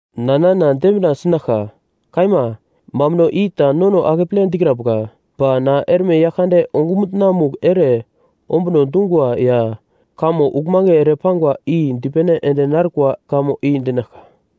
Na nana dembina sinaglka. Kaima, mambuno i ta nono akeple dikrambuka. Ba na erme Yaglkande ongumutna-mugl ere ombuno dungwa ya kamo uglmange ere pangwa i dipene ende narkwa kamo i dinaglka.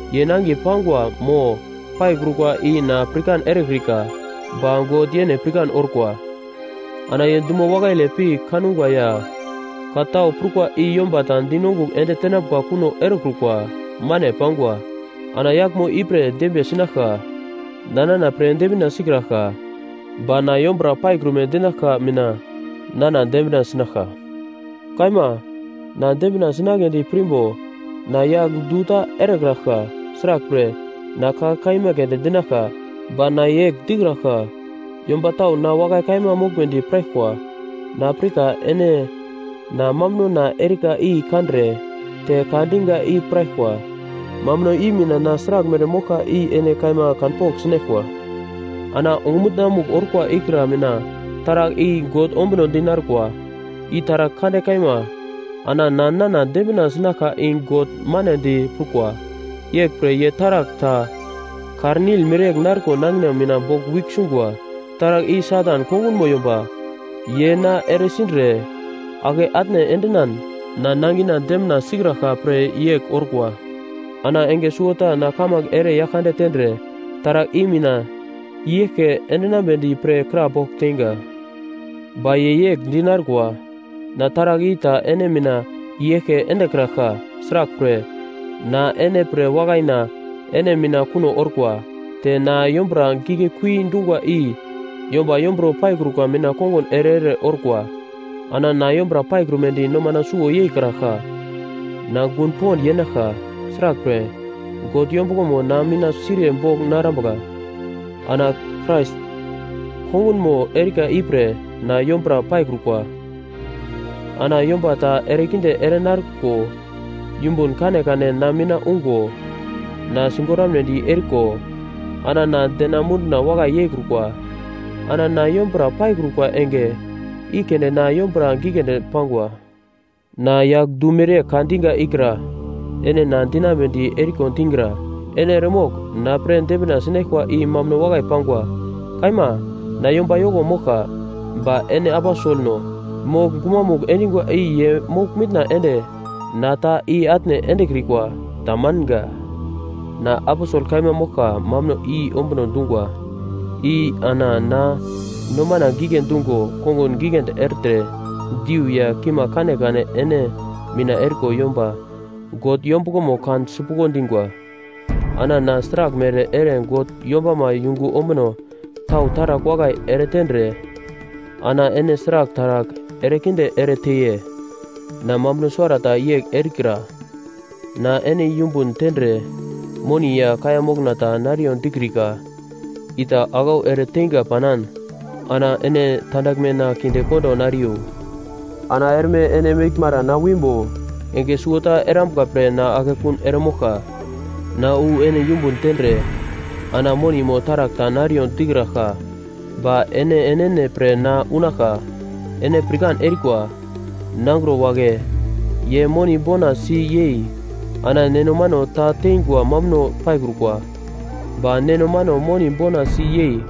Ye nangiye pangwa mo paikrukwa i na pirkan erekrika, ba God yene pirkan orkwa, ana ye dumo wakaile pi kangwa ya ka tau prukwa i yomba ta di nongugl ende tenambuka kuno erekrukwa, mane pangwa Ana yaglmo ipre na dembiye sinaglka. Na nana pre dembina sikraglka. Ba na yombura paikrume dinaglka i mina nana dembina sinaglka. Kaima, na dembina sinagledi pirmbo na yagl du ta erekraglka; sraglpre, na ka kaima keunde dinaglka. Ba na yegl dikraglka; yomba tau na wakai kaima moglmedi piraglkwa. Na pirka ene na mambunona erika i kandre te ka diga i piraglkwa. Mambuno i mina na sraglmere moglka i ene kaima kanpogl sinaglkwa. Ana ongumutna-mugl orkwa ikra mina taragl i God ombunodi narkwa, i taragl kande kaima. Ana na nana dembina sinaglka i God manedi prukwa. Yeglpre ye taragl ta kar-nil mereyegl narko nangina mina boglwigl sungwa. Taragl i Satan kongunmo yomba, ye na eresindre, ake atne endinan na nangina dembina sikraglka pre yegl orkwa. Ana enge suwota na kamange ere Yaglkande tendre taragl i na mina i-yeglke endinambedi pre krapogl teinga. Ba ye yegl di narkwa, “Na taragl i ta ene mina i-eglke endekraglka. Sraglpre, na ene pre wakaina ene mina kuno orkwa, te na yombura giglekui dungwa i yomba yomburo paikrukwa mina kongun ere-ere orkwa.” Ana na yombura paikrumedi nomana suwo yeikraglka. Na gun pond yenaglka. Sraglpre, God yombuglomo na mina siriye bogl narambuka. Ana Krais kongunmo erika ipre na yombura paikrukwa. Ana yomba na erekinde ere nariko, yumbun kanekane na mina ungo, na sigoramnedi eriko, ana na dena munduna wakai yeikrukwa. Ana na yombura paikrukwa enge, i keunde na yombura giglendi pangwa. Na yagl du mereyegl ka diga ikra ene na dinambedi eriko digra. Ene eremogl na pre dembina sinaglkwa i mambuno wakai pangwa. Kaima, na yomba yoko moglka. Ba ene “aposelno” mogl gumamugl endingwa i ye mogl-mitna ende na ta i-atne endekrikwa. Tamanga. Na aposel kaima moglka mambuno i ombuno dungwa i ana na nomana gigle dungo kongun giglendi ertre diu ya kimagl kanekane ene mina eriko yomba God yombuglomo kan sipuglo dingwa. Ana na sraglmere ere God yombama yungu ombuno tau taragl wakai eretendre ana ene sragl taragl erekinde ere teiye? Na mambuno suwarata yegl erikra, na ene yumbun tendre moni ya kaiya mokna ta nariyo dikrikra. I ta aglau ereteinga panan ana ene tandaglmena kinde kondo nariyo! Ana erme ene meglmara na wimbo, enge suwota erambuka pre na akekun eremoglka. Na wu ene yumbun tendre ana moni mo taragl ta nariyo dikraglka, ba ene enene pre na unaglka. Ene pirkan erikwa, nangro wagle ye moni bona si yei ana neno mano ta teingwa mambuno paikrukwa. Ba neno mano moni bona si yei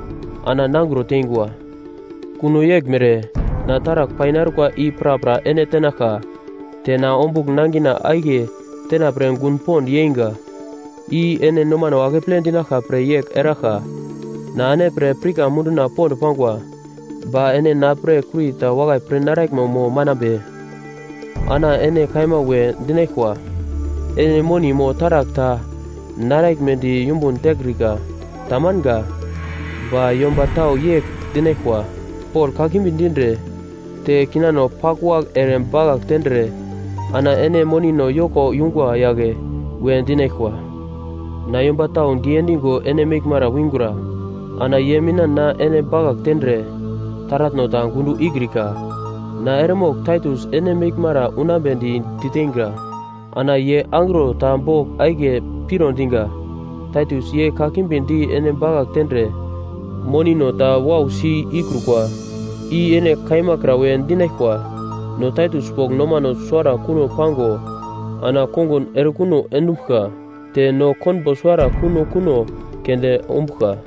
ana nangro tengwa. Kuno yeglmere, na taragl painarkwa i prapra ene tenaglka, te na ombugl nangina akiye tenapre gun pond yeinga. I ene nomano akeple dinaglka pre yegl eraglka. Na ene pre pirka munduna pond pangwa. Ba ene na pre kurita wakai pir naraglmo mo manambe? Ana ene kaima we dinaglkwa, ene moni mo taragl ta naraglmedi yumbun tekrika. Tamanga. Ba yomba tau yegl dinaglkwa, Pol kakimbi dindre te kinano paglwagl ere bakagl tendre ana ene monino yoko yungwa yagle we dinaglkwa. Na yomba tau diendigo ene meglmara wingura. Ana ye mina na ene bakagl tendre, taratno ta gundo ikrika. Na eremogl Taitus ene meglmara unambedi diteinga. Ana ye angro ta bogl akiye piro diga. Taitus ye kakimbi di ene bakagl tendre monino ta wausi ikrukwa! I ene kaima kra we dinaglkwa. No Taitus bogl nomano suwara kuno pango ana kongun erekuno endumbuglka! Te no konbo suwara kuno kuno keunde ombuglka.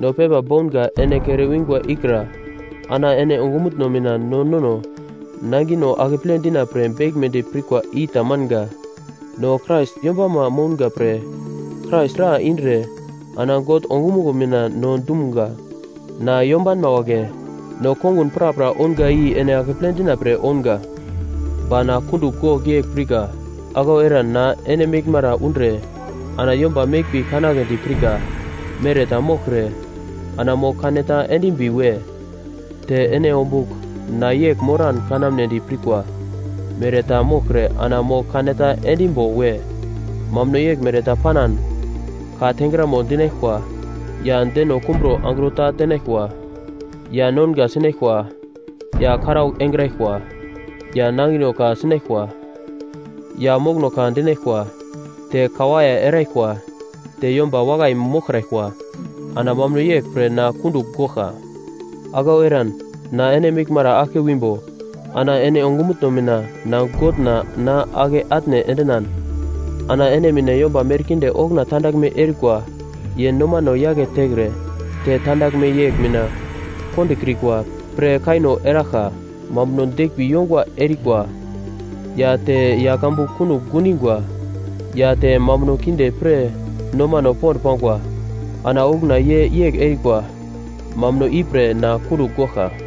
No pepa bounga ene kere wingwa ikra ana ene ongumutno mina no nono nangino akeple dina pre beglmedi pirkwa i tamanga! No Krais yombama mounga pre Krais dra indre ana God ongumuglo mina no dumga. Na yombanma wagle, no kongun prapra ounga i ene akeple dina pre ounga. Ba na kundugl gogl yegl pirka; aglau eran na ene meglmara undre ana yomba meglmbi kanagledi pirka mere ta moglkre, ana mogl kaneta endimbi we! Te ene ombugl na yegl moran kanamnedi pirkwa mere ta moglkre ana mogl kaneta endimbo we! Mambuno yeglmere ta panan: Ka tengramo dinaglkwa, ya deno kumburo angro ta tenaglkwa. Ya nonga sinaglkwa, ya karaugl engraglkwa, ya nangino ka sinaglkwa, ya mokono ka dinaglkwa, te kawaiye eraglkwa, te yomba wakai moglkraglkwa. Ana mambuno yegl pre na kundugl goglka. Aglau eran na ene meglmara aglke wimbo, ana ene ongumutno mina na Godna na ake atne endinan; ana ene mina yomba merkinde okuna tandaglme erikwa ye nomano yake tekre te tandaglme yegl mina kondokrikwa pre kaino eraglka; mambuno deglmbi yongwa erikwa, ya te yagl ambu kunogl gundingwa, ya te mambuno kinde pre nomano pond pangwa. Ana okuna ye yegl erikwa. Mambuno ipre na kundugl goglka.